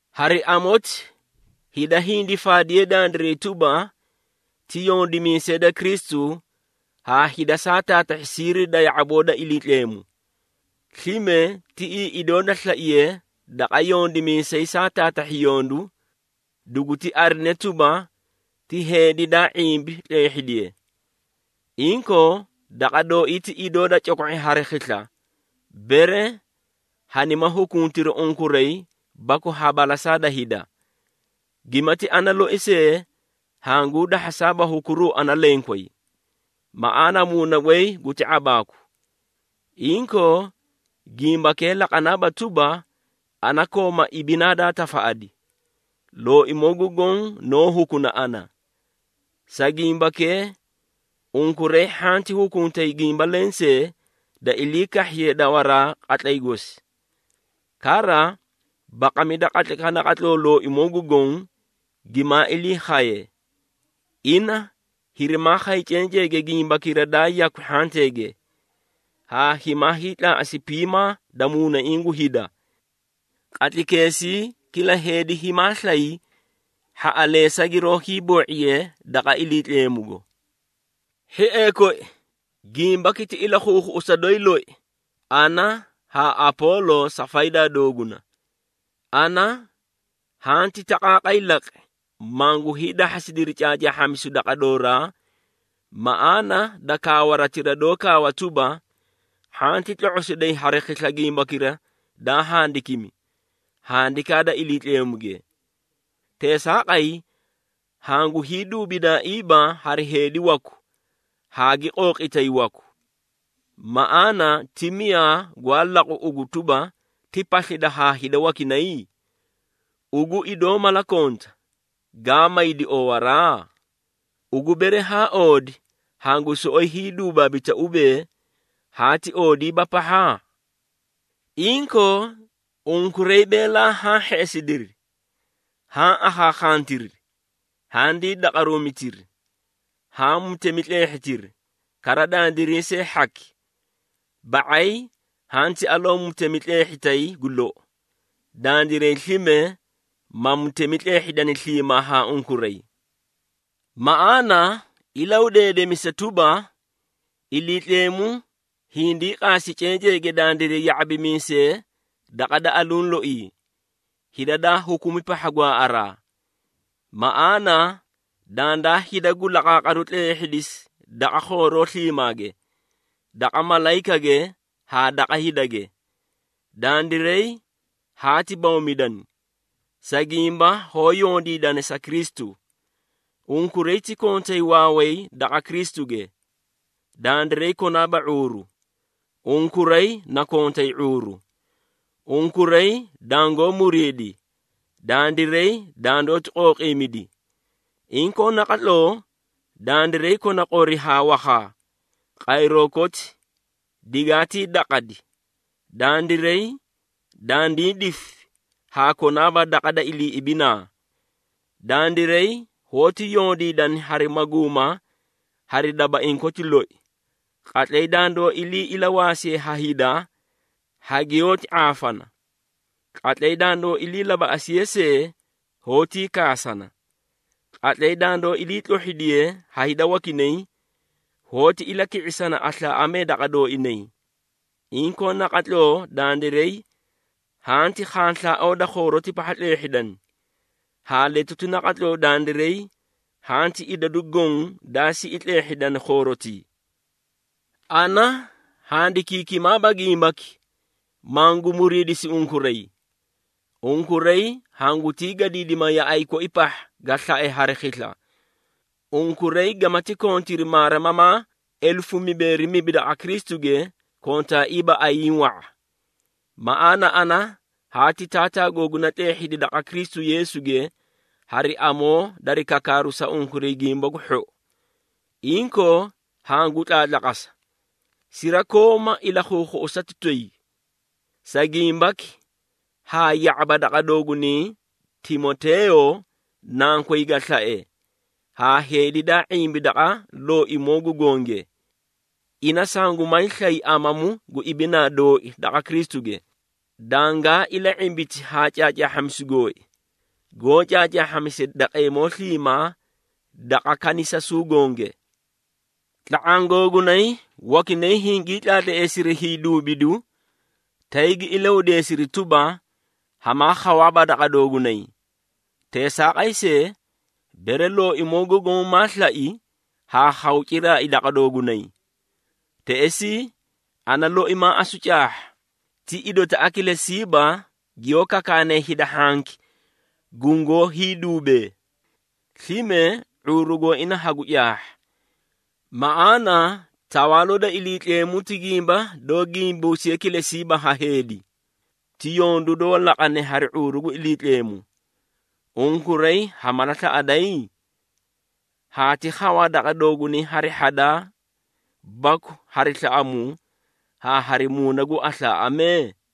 Hari amoti hida hindi faadiyee dandiray tuba, ti yondimiisee da Kristu haa hida saa taatahhi siiri da ya⁄aboo da Iliitleemu. Slime, tiꞌii idoo da slaiye daqa yondimiisay saa taatahhi yondu, duguti arine tuba, ti heedi daa ⁄imbi tleehhidiye. Inkoo, daqa dooii ti idoo da coko⁄i hari khisla, bere hanima hukuntiri unkuray baku ha balasaa da hida. Gimati ana loi see hanguu dahhasaaba hukuruu ana lenkway. Maꞌaana muuna goy guti ⁄abaaku. Inkoo gimbakee laqanaaba tuba, ana kooma ibinaa daa tafaꞌadi. Looimoo gu Goõ noó hukuna ana. Sa gimbakee, unkuray hhanti hukuntay gimba lensee, da ilii kahhiye dawaraa qatlay gosi. Kara, baqamida qatlaykaꞌa naqatloo Looimoo gu Goõ gimaa ilii khaye. Ina hirimaa khay cenceege gimbakira daa yakwi hhanteege, haa himaa hiitlaaꞌasi piimaa da muunaiĩ gu hida. Qatlaykeesii kila heedi himaa slay hhaꞌaleesa giroó hiiboo⁄iye daqa Iliitleemugo. Hhiee koi, gimbaki ti ilakhuukhuꞌusa doyi loi ana haa Apoolo sa faydaa dooguna. Ana hanti taqaaqay laqi, mangu hiidahhasidiri caacaahhamisu daqa dooraa maꞌaana da kaawaratira doó kaawa tuba, “Hhanti tlo⁄osiday hari khisla gimbakira daa handikimi, Handikaa da Iliitleemuge.” Teesaaqay, hangu hiiduubidaaiiba hari heedi waku haa gi qooqitay waku. Maꞌaana ti miyaa gwaa laqu ugu tuba, ti paslida haa hida wakinay? Ugu idoo mala konta, gaa maydi oowaraa? Ugu bere haa oodi, hangu soꞌoyi hiiduubaabita ubee, haati oodiiba pahha? Inkoo, unkuray beelaa haã hheꞌesidiri, haã akhankhantiri! Handii daqaruumitiri! Haã mutemi tleehhitiri, kara dandiray see hhaki! Ba⁄ay hanti aloo mutemi tleehhita gu lou, dandiray slime ma mutemi tleehhidani sliimaa haa unkuray! Maꞌaana ilahudeedemisa tuba, Iliitleemu hindii qaasi cenceege dandiray ya⁄abimiisee daqa da aluũ loii, hida daa hukumi pahha gwaaꞌaraa. Maꞌaana dandaa hida gu laqaaqaru tleehhidisi daqa khooroo sliimaage, daqa malayikage haa daqa hidage. Dandiray haati bawmidani, sa gimba hoó yondiidana sa Kristu. Unkuray ti kontay waaway daqa Kristuge. Dandiray konaaba ⁄uuru. Unkuray na kontay ⁄uuru. Unkuray dangoó muriidi. Dandiray dandoóti qooqiimidi. Inkoo naqatloo, dandiray kona qori haa wakhaa, qayroo koti digaatii daqadi. Dandiray dandii difi haa konaaba daqa da ilii ibinaa. Dandiray hoóti yondiidana hari maguuma hari dabaiĩ koti loi. Qatlay dandoó ilii ilawaasiye ha hida, hagiyoóti ⁄aafana. Qatlay dandoó ilii labaꞌasiye see, hoótii kaasana. Qatlay dandoó iliitlohhidiye ha hida wakinay, hoóti ilaki⁄isana aslaaꞌamee daqa dooinay. Inkoo naqatloo dandiray hanti khanslaaoo da khooroti pahha tleehhidani, haa letuti naqatloo dandiray hanti idadu goõ daa siꞌi tleehhidani khoorotii. Ana handikiikimaaba gimbaki, mangu muriidisi unkuray. Unkuray hangutii gadiidima yaꞌay koi pahha, ga slae hari khisla. Unkuray gamati kontiri maarimamaa elefu mibeeri mibi daqa Kristuge, kontaaiiba ayiĩ wa⁄a. Maꞌaana ana haati taataa googuna tleehhidi daqa Kristu Yeesuge hari amoo dari kakaaru sa unkuray Gimba gu Hhou. Inkoo, hangu tlaatlaqasa, sirakooma ilakhuukhuꞌusati toyi. Sa gimbaki haa ya⁄abi daqa doogunay Timoteeyo, nankoy ga slae haa heedi daa ⁄imbi daqa Looimoo gu Gonge. Ina sangumaay slay amamu gu ibinaa dooi daqa Kristuge, dangaa ila⁄imbiti haa caacaahhamisu gooi, goó caacaahhamise daqeemoo sliimaa daqa kanisasuu gonge. Tla⁄aã googunay wakinay hingii tlaatleesiri hiiduubidu, tay gi ilahudeesiri tuba, hamaa khawaaba daqa doogunay. Teesaaqay see, bere Looimoo gu Goõ maa slai, haa khaw ciraai daqa doogunay. Teꞌesii, ana loi maa asu caahha, ti idotaꞌa kilesiiba giyoó kakaanee hida hhanki gungoó hiiduubee, slime ⁄uuru gooina hagu caahha. Maꞌaana Tawaaloo da Iliitleemu ti gimba doó gimbusiye kilesiiba ha heedi, ti yondu doó laqane hari ⁄uuru gu Iliitleemu. Unkuray ha mala slaꞌaday? Haati khawaa daqa doogunay hari hhadaa baku hari slaꞌamuu haa hari muuna gu aslaaꞌamee?